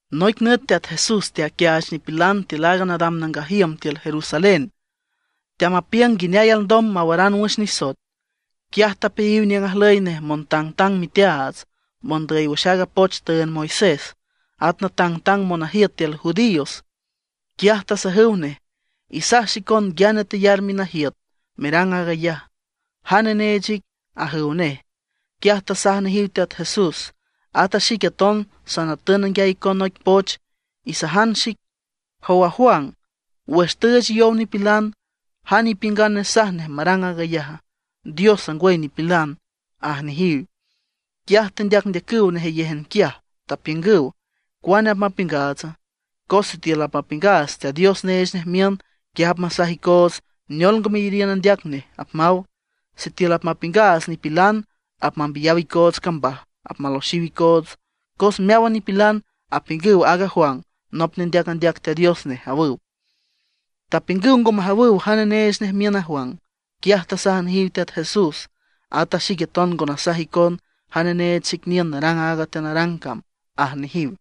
Noic nüt Teat Jesús teaquiaach nipilan tiül aaga nadam nangaj iüm tiül Jerusalén, teamapiüng nguineay alndom mawaran wüx nisoet. Quiaj tapeayiw niüng ajlüy nej montangtang miteaats, mondüy wüx aaga poch tüünd Moisés, at natangtang monajiüt tiül judíos. Quiaj tasajüw nej: ―Isaj xicon nguiane teyar minajiüt merang aag ayaj. ¿Jane neech ic? ―ajüw nej. Quiaj tasaj nejiw Teat Jesús: ―Ata xique aton sanatün nanguiay icon noic poch. Isajan xic: Jow aaga Juan, wüx tüüch yow nipilan, ¿jane ipiüngan nesaj nej marang aag ayaja? ¿Diosa, ngwüy nipilana? ―aj nejiw. Quiaj tendeacndeacüw nejeyéjan quiaj, tapiüngüw: ―¿Cuane apmapiüngaatsa? Cos sitiül apmapiüngaats Teat Dios neech nej miün, quiaj apmasaj icoots: “¿Neol ngo meyariün andeac neje?” apmaw. Sitiül apmapiüngaats nipilan, apmambiyaw icoots cambaj, apmaloxiw icoots, cos meáwan nipilan apiüngüw aaga Juan nop nendeac andeac Teat Dios nej ―awüw. Tapiüngüw ngo majawüw jane neech nej miün a Juan. Quiaj tasaj nejiw Teat Jesús: ―Ata xique aton ngo nasaj icon jane neech xic niün narang aaga teanarang cam ―aj nejiw.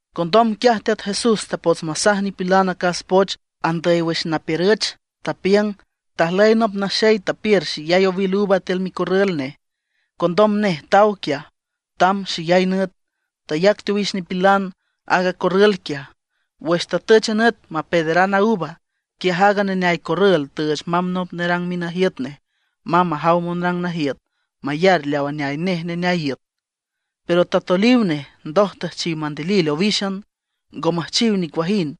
Condom quiaj Teat Jesús tapots masaj nipilan acas poch andüy wüx napiürüch, tapiüng: ―Tajlüy nop naxey tapiür xeyay owil uva tiül micorrül nej, condom nej taw quiaj tamb xeyay nüt. Tayac teowix nipilan a corrül quiaj. Wüx tatüch a nüt mapeederan a uva, quiaj aaga neneay corrül tüüch mamb nop nerang minajiüt nej mamb majaw monrang najiüt mayar leaw aneay nej neneay iüt. Pero tatoliw nej, ndoj tüjchiw mandilil owíxan, ngo müjchiw nicuajind.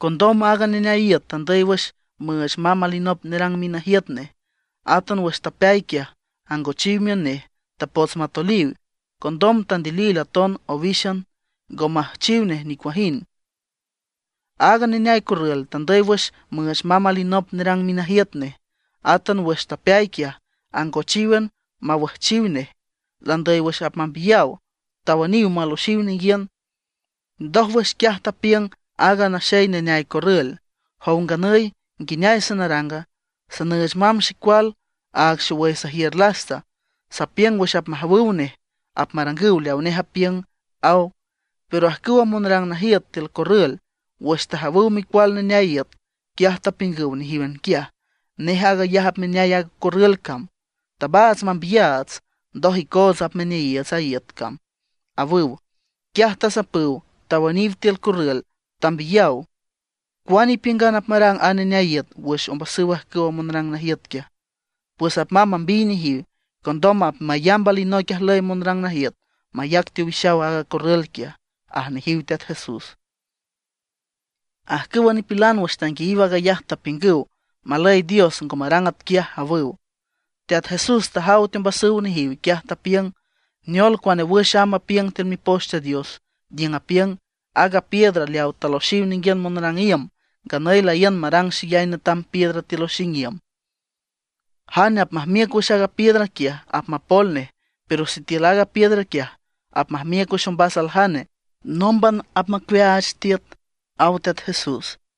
Condom aaga neneay iüt tandüy wüx müüch mamb alinop nerang minajiüt nej. Átan wüx tapeay quiaj angochiw miün nej, tapots matoliw. Condom tandilil aton owíxan, ngo müjchiw nicuajind. Aaga neneay corrül tandüy wüx müüch mamb alinop nerang minajiüt nej. Átan wüx tapeay quiaj, angochíwan mawüjchiw nej, landüy wüx apmambiyaw. Tawüniw maloxiw ninguiün. ’Ndójwüx quiaj tapiüng aaga naxey neneay corrül: “Jow nganüy, ¿nguineay sanaranga? Sanüüch mamb xecual, aag xowüy sajiür lasta. Sapiüng wüx apmajawüw nej apmarangüw leawa nej apiüng”, aw. Pero ajcüwa monrang najiüt tiül corrül wüx tajawüw micual neneay iüt, quiaj tapiüngüw nejíwan quiaj: “Nej aag ayaj apmaneay aaga corrül cam. Tabaats mambiyaats, ndoj icoots apmaneayiiüts a iüt cam”, awüw. Quiaj tasapüw, tawüniw tiül corrül, tambiyaw. ¿Cuane ipiüngan apmarang a neneay iüt wüx ombasüw ajcüwa monrang najiüt quiaja? Pues apmamb mambiy nejiw, condom apmayamb alinoic ajlüy monrang najiüt mayac teowixaw aaga corrül quiaj ―aj nejiw Teat Jesús. Ajcüwa nipilan wüx tanguiayiw aag ayaj, tapiüngüw: ―¡Malüy Dios ngo marang atquiaj! ―awüw. Teat Jesús tajaw teombasüw nejiw, quiaj tapiüng: ―¿Neol, cuane wüx amb apiüng tiül Mipoch Teat Dios? niüng apiüng: Aaga piedra leawa taloxiw ninguiün monrang iüm, nganüy laíün marang xeyay netam piedra tiül oxing iüm. Jane apmajmiüc wüx aaga piedra quiaj, apmapol nej; pero sitiül aaga piedra quiaj apmajmiüc wüx ombas aljane, nómban apmacuiaach tiüt ―aw Teat Jesús.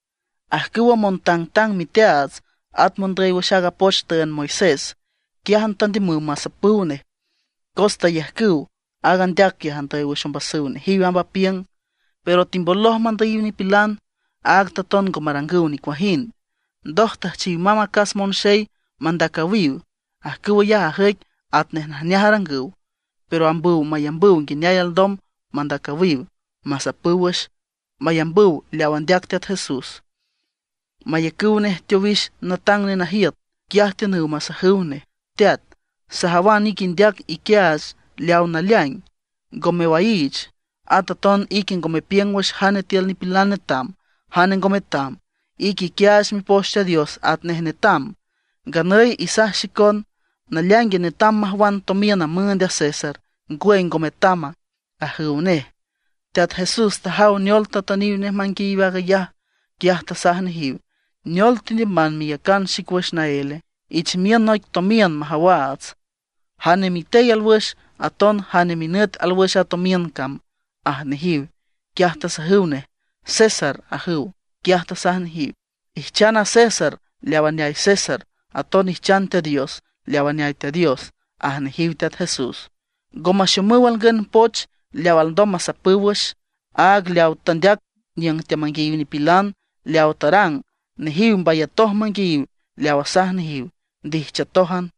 Ajcüwa montangtang miteaats at mondüy wüx aaga poch tüünd Moisés quiájan tandiümüw masapüw nej, cos tayajcüw aaga andeac quiaj andüy wüx ombasüw nejiw amb apiüng. Pero timboloj mandüyiw nipilan, áag taton ngo marangüw nicuajind. Ndoj tüjchiw mamb acas monxey mandacüwiw. Ajcüw ayaj ajüic atnej najneaj arangüw, pero ambüw mayambüw nguineay alndom mandacüwiw, masapüw wüx, mayambüw leaw andeac Teat Jesús, mayacüw nej teowix natang nenajiüt. Quiaj tiünüw masajüw nej: ―Teat, sajawan ique indeac iquiaach leaw naleaing, ngo mewaiich. At aton ique ngo mepiüng wüx jane tiül nipilan netam, jane ngo metam. Ique iquiaach Mipoch Teat Dios atnej netam. Nganüy isaj xicon ¿naleaing netam majwan tomiün müünd aaga César, ngwüy ngo metama? ―ajüw nej. Teat Jesús tajaw neol tatüniw nej manguiayiw aag ayaj, quiaj tasaj nejiw: ―¿Neol tendiüman meyacan xic wüx naéle? Ich miün noic tomiün majawaats. ¿Jane mitey alwüxe, aton jane minüt alwüx a tomiün cama? ―aj nejiw. Quiaj tasajüw nej: ―César ―ajüw. Quiaj tasaj nejiw: ―Ijchan a César leaw aneay nej, aton ijchan Teat Dios leaw aneay Teat Dios ―aj nejiw Teat Jesús. Ngo maxomüw alngün poch leaw alndom masapüw wüx, áag leawa tandeac niüng teamanguiayiw nipilan. Leawa tarang, nejiw mbayatoj manguiayiw leaw asaj nejiw, ndijchiütójan.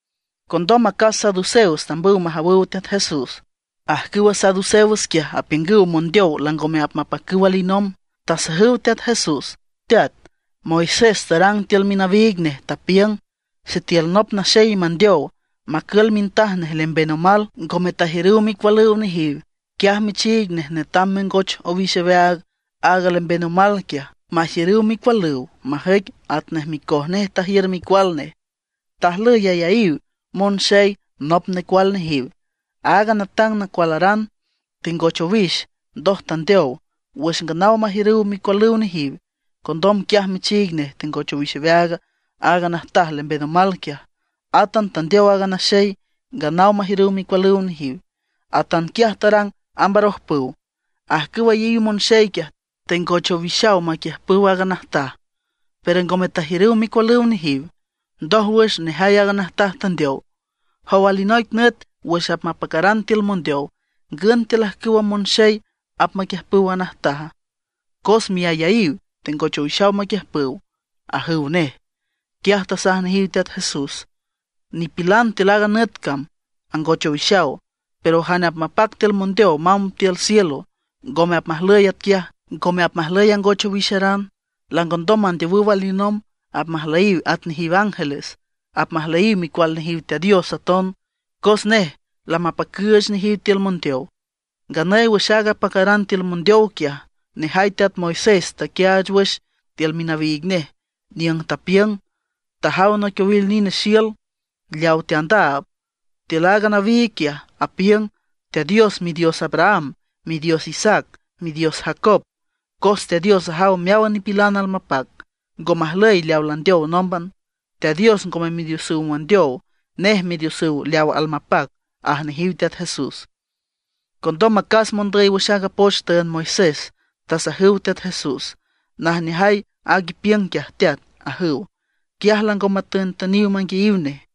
Condom acas saduceos tambüw majawüw Teat Jesús. Ajcüwa saduceos quiaj apiüngüw mondeow langome apmapacüw alinomb. Tasajüw Teat Jesús: ―Teat, Moisés tarang tiül minawiig nej, tapiüng: Sitiül nop naxey mandeow, macül mintaj nej lemben omal, ngome tajiürüw micualüw nejiw, quiaj michiig nej netam mengoch owix aweaag aaga lemben omal quiaj, majiürüw micualüw majüic atnej micoj nej tajiür micual nej. Tajlüy ayaíw monxey nop necual nejiw. Aaga natang nacualaran tengoch owix, ndoj tandeow wüx nganaw majiürüw micualüw nejiw. Condom quiaj michiig nej tengoch owix aweaag aaga najtaj lemben omal quiaj. Átan tandeow aaga naxey, nganaw majiürüw micualüw nejiw. Atanquiaj tarang amb arojpüw. Ajcüw ayaíw monxey quiaj, tengoch owix maquiiüb aaga najtaj, pero ngome tajiürüw micualüw nejiw. Ndójwüx nejay aaga najtaj tandeow. ¿Jow alinoic nüt wüx apmapacaran tiül mondeow, ngün tiül ajcüwa monxey apmaquiüjpüw aaga najtaja? Cos miayaíw tengoch owixaw maquiüjpüw ―ajüw nej. Quiaj tasaj nejiw Teat Jesús: ―Nipilan tiül aaga nüt cam angoch owixaw. Pero jane apmapac tiül mondeow mamb tiül cielo, ngome apmajlüy atquiaj, ngome apmajlüy angoch owixeran. Langondom mandeowüw alinomb, apmajlüyiw at nejiw ángeles, apmajlüyiw micual nejiw Teat Dios aton, cos nej lamapacüüch nejiw tiül mondeow. Nganüy wüx aaga apacaran tiül mondeow quiaj, nejay teat Moisés taquiaach wüx tiül minawiig nej niüng tapiüng tajaw noic owil nine xiül leaw teandaab. Tiül aaga nawiig quiaj apiüng: Teat Dios Midios Abraham, Midios Isaac, Midios Jacob. Cos Teat Dios ajaw meáwan nipilan almapac, ngo majlüy leaw landeow nómban. Teat Dios ngome midiosüw mondeow, nej midiosüw leaw almapac ―aj nejiw Teat Jesús. Condom acas mondüy wüx aaga poch tüünd Moisés tasajüw Teat Jesús: ―Najneajay aaga ipiüng quiaj Teat ―ajüw. Quiaj lango matüntüniw manguiayiw nej.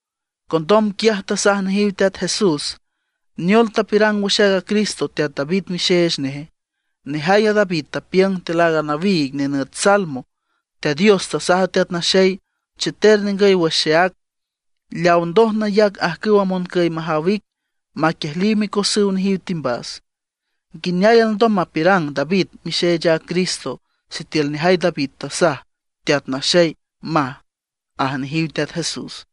Condom quiaj tasaj nejiw Teat Jesús: ―¿Neol tapiürang wüx aaga Cristo, teat David mixeech neje? Nejay a David tapiüng tiül aaga nawiig nenüt Salmo: Teat Dios tasaj a Teat Naxey: “Cheter ningüy wüx xeác, leaw ndoj nayac ajcüwa moncüy majaw ic maquiejliw micosüw nejiw timbas.” ¿Nguineay alndom mapiürang David mixeech aaga Cristo sitiül nejay David tasaj: Teat Naxey? maj, ―aj nejiw Teat Jesús.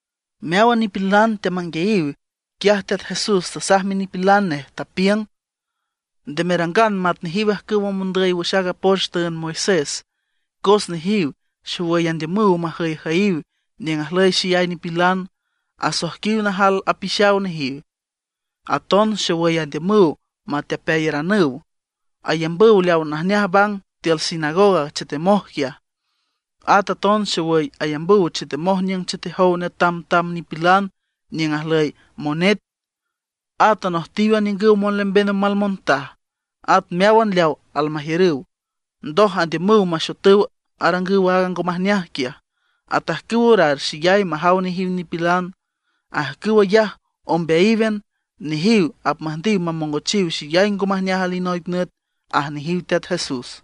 Meáwan nipilan teamanguiayiw, quiaj Teat Jesús tasaj minipilan nej, tapiüng: ―Nde merangan mat nejiw ajcüwa mondüy wüx aaga poch tüünd Moisés, cos nejiw xowüy andiümüw majüyjüyiw niüng ajlüy xeyay nipilan, asoijquiw najaljal apixaw nejiw. Aton xowüy andiümüw matepeayaranüw. Ayambüw leaw najneaj bang tiül sinagoga chetemoj quiaj. At aton xowüy ayambüw chetemoj niüng chetejow netamtam nipilan niüng ajlüy monet. At anojtiw aniüngüw monlemben omal montaj, at meáwan leaw almajiürüw. Ndoj andiümüw maxotüw arangüw aaga ngo majneaj quiaj, atajcüw orar xeyay majaw nejiw nipilan. Ajcüw ayaj ombeayíwan, nejiw apmüjndiw mamongochiw xeyay ngo majneaj alinoic nüt ―aj nejiw Teat Jesús.